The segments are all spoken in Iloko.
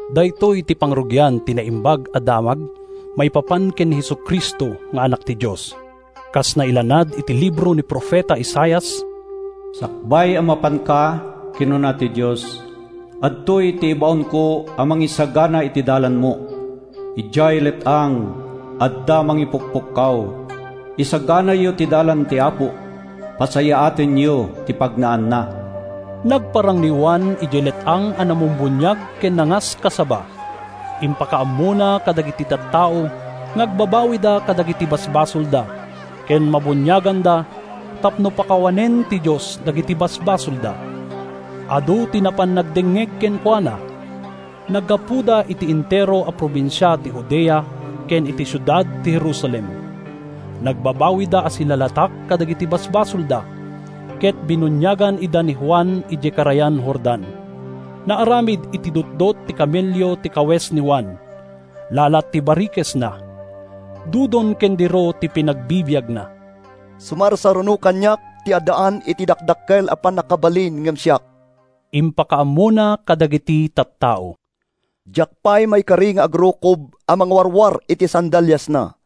Daytoy ti pangrugian ti Naimbag a Damag maipapan ken ni Jesu-Cristo nga Anak ti Dios, kas nailanad iti libro ni profeta Isaias: “‘Sakbay a mapanka,’ kinuna ti Dios, ‘adtoy ti ibaonko a mangisagana iti dalanmo.’ Idiay let-ang, adda mangipukpukkaw: ‘Isaganayo ti dalan ti Apo, pasayaatenyo ti pagnaanna!’” Nagparang ni Juan idiay let-ang a namumbuniag ken nangaskasaba. Impakaammona kadagiti tattao nga agbabawida kadagiti basbasolda ken mabuniaganda tapno pakawanen ti Dios dagiti basbasolda. Adu ti napan nagdengngeg kenkuana. Naggapuda iti entero a probinsia ti Judea ken iti siudad ti Jerusalem. Nagbabawida a silalatak kadagiti basbasolda ket binuniagan ida ni Juan idiay karayan Jordan. Naaramid iti dutdot ti kamelio ti kawes ni Juan. Lalat ti barikesna. Dudon ken diro ti pinagbibiagna. “Sumarsaruno kaniak ti addaan iti dakdakkel a pannakabalin ngem siak,” impakaammona kadagiti tattao. “Diak pay maikari nga agrukob a mangwarwar iti sandaliasna.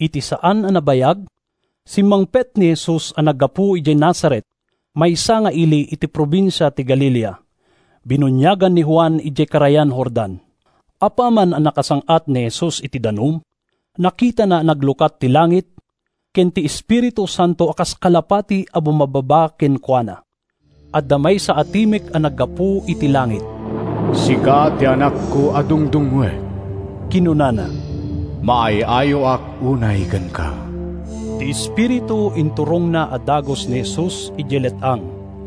Iti saan a nabayag, simmangpet ni Jesus a naggapu idiay Nazaret, maysa nga ili iti probinsia ti Galilea. Binuniagan ni Juan idiay karayan Jordan. Apaman a nakasang-at ni Jesus iti danum, nakitana a naglukat ti langit ken ti Espiritu Santo a kas kalapati a bumabbaba kenkuana. Adda maysa a timek a naggapu iti langit. “Sika ti Anakko a dungdungngoek,” kinunana. “Maay-ayoak unay kenka.” Ti Espiritu inturongna a dagus ni Jesus idiay let-ang.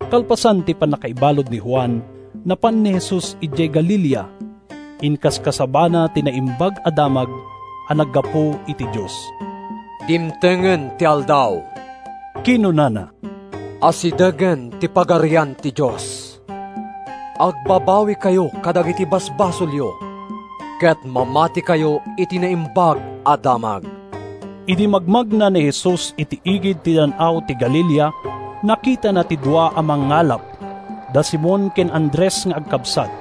Kalpasan ti pannakaibalud ni Juan, napan ni Jesus idiay Galilea. Inkaskasabana ti Naimbag a Damag a naggapu iti Dios. “Dimtengen ti aldaw,” kinunana. “Asidegen ti Pagarian ti Dios. Agbabawikayo kadagiti basbasolyo ket mamatikayo iti Naimbag a Damag.” Idi magmagna ni Jesus iti igid ti Dan-aw ti Galilea, nakitana ti dua a mangngalap, da Simon ken Andres nga agkabsat,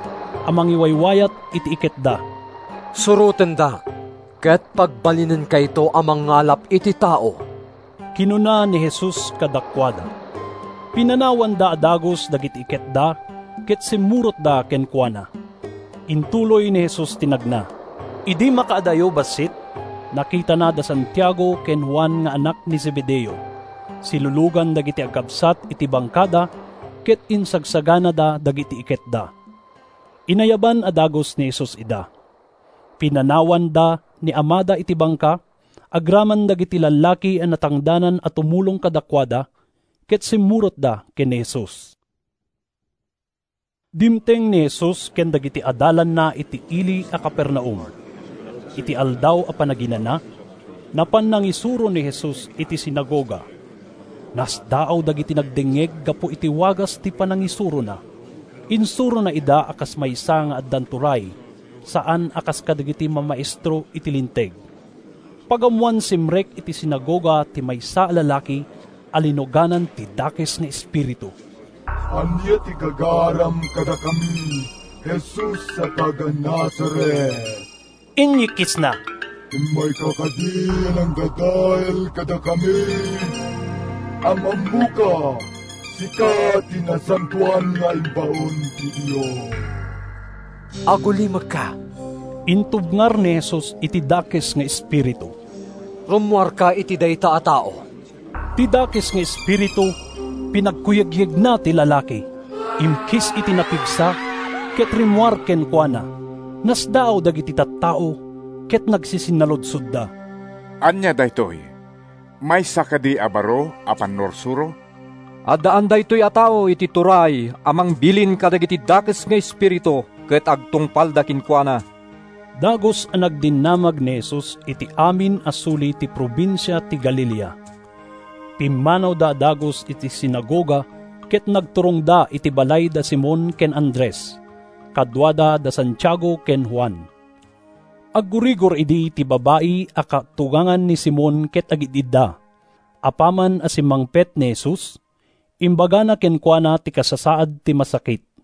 a mangiwaywayat iti iketda. “Surotendak ket pagbalinenkayto a mangngalap iti tao,” kinuna ni Jesus kadakuada. Pinanawanda a dagus dagiti iketda ket simmurotda kenkuana. Intuloy ni Jesus ti nagna. Idi makaadayo bassit, nakitana da Santiago ken Juan nga annak ni Zebedeo. Silulugan dagiti agkabsat iti bangkada ket isagsaganada dagiti iketda. Inayaban a dagus ni Jesus ida. Pinanawanda ni amada iti bangka, agraman dagiti lallaki a natangdanan a tumulong kadakuada, ket simmurotda ken ni Jesus. Dimteng ni Jesus ken dagiti adalanna iti ili a Capernaum. Iti Aldaw a Panaginana, napan nangisuro ni Jesus iti sinagoga. Nasdaaw dagiti nagdengngeg gapu iti wagas ti panangisurona. Insurona ida a kas maysa nga addan turay, saan a kas kadagiti mamaestro iti Linteg. Pagammoan, simrek iti sinagoga ti maysa a lalaki a linuganan ti dakes nga espiritu. “Ania ti gagaram kadakami, Jesus a taga-Nazaret?” inyikkisna. “Immayka kadi a mangdadael kadakami? Am-ammoka: sika ti nasantoan nga imbaon ti Dios!” “Agulimekka!” intubngar ni Jesus iti dakes nga espiritu. “Rummuarka iti dayta a tao!” Ti dakes nga espiritu pinagkuyegyegna ti lalaki, imkis iti napigsa ket rimmuar kenkuana. Nasdaaw dagiti tattao ket nagsisinnaludsodda, “Ania daytoy? Maysa kadi a baro a pannursuro? Addaan daytoy a tao iti turay a mangbilin kadagiti dakes nga espiritu ket agtungpalda kenkuana!” Dagus a nagdinamag ni Jesus iti amin a suli ti probinsia ti Galilea. Pimmanawda a dagus iti sinagoga ket nagturongda iti balay da Simon ken Andres. Kaduada da Santiago ken Juan. Aggurigor idi ti babai a katugangan ni Simon ket agid-idda. Apaman a simmangpet ni Jesus, imbagada kenkuana ti kasasaad ti masakit.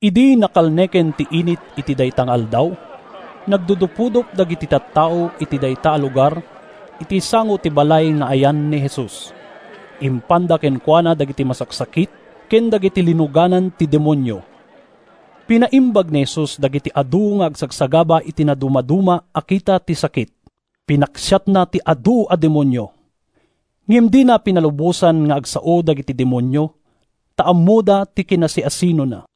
Idi nakalneken ti init iti dayta nga aldaw, nagdudupudop dagiti tattao iti dayta a lugar iti sango ti balay nga ayan ni Jesus. Impanda kenkuana dagiti masaksakit ken dagiti linuganan ti demonio. Pinaimbag ni Jesus dagiti adu nga agsagsagaba iti nadumaduma a kita ti sakit. Pinaksiatna ti adu a demonio. Ngem dina pinalubosan nga agsao dagiti demonio ta ammoda ti kinasiasinona.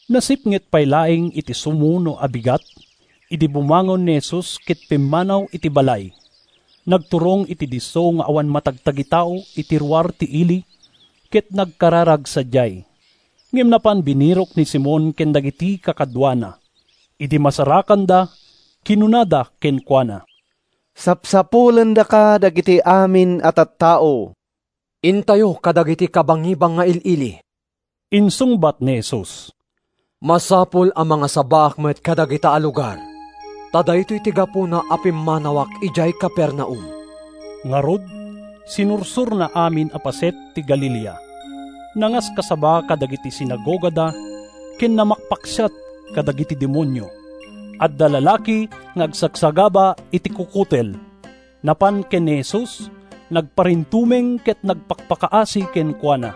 Nasipnget pay laeng iti sumuno a bigat idi bumangon ni Jesus ket pimmanaw iti balay. Nagturong iti disso nga awan matagtagitao iti ruar ti ili, ket nagkararag sadiay. Ngem napan binirok ni Simon ken dagiti kakaduana. Idi masarakanda kinunada kenkuana, “Sapsapulendaka dagiti amin a tattao.” “Intayo kadagiti kabangibang nga il-ili,” insungbat ni Jesus. “Masapul a mangasabaak met kadagita a lugar, ta daytoy ti gapuna a pimmanawak idiay Capernaum.” Ngarud, sinursorna amin a paset ti Galilea. Nangaskasaba kadagiti sinagogada ken namakpaksiat kadagiti demonio. Adda lalaki nga agsagsagaba iti kukutel. Napan ken ni Jesus, nagparintumeng ket nagpakpakaasi kenkuana.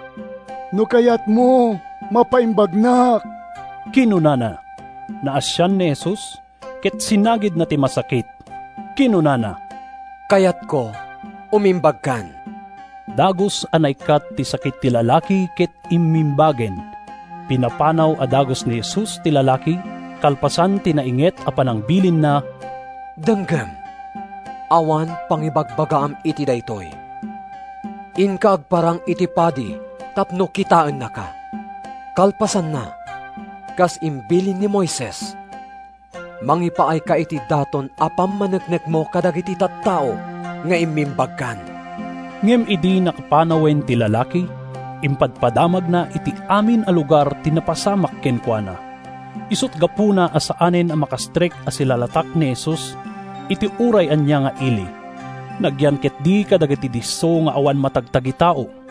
“No kayatmo, mapaimbagnak,” kinunana. Naasian ni Jesus, ket sinagidna ti masakit. Kinunana, “Kayatko. Umimbagkan!” Dagus a naikkat ti sakit ti lalaki ket immimbagen. Pinapanaw a dagus ni Jesus ti lalaki kalpasan ti nainget a panangbilinna: “Denggem! Awan pangibagbagaam iti daytoy. Inka agparang iti padi tapno kitaennaka. Kalpasanna, kas imbilin ni Moises, mangipaayka iti daton a pammaneknekmo kadagiti tattao nga immimbagkan.” Ngem idi nakapanawen ti lalaki, impadpadamagna iti amin a lugar ti napasamak kenkuana. Isut’ gapuna a saanen a makastrek a silalatak ni Jesus iti uray ania nga ili. Nagyan ketdi kadagiti disso nga awan matagtagitao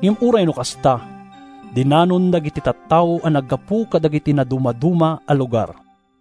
ngem uray no kasta, dinanon dagiti tattao a naggapu kadagiti nadumaduma a lugar.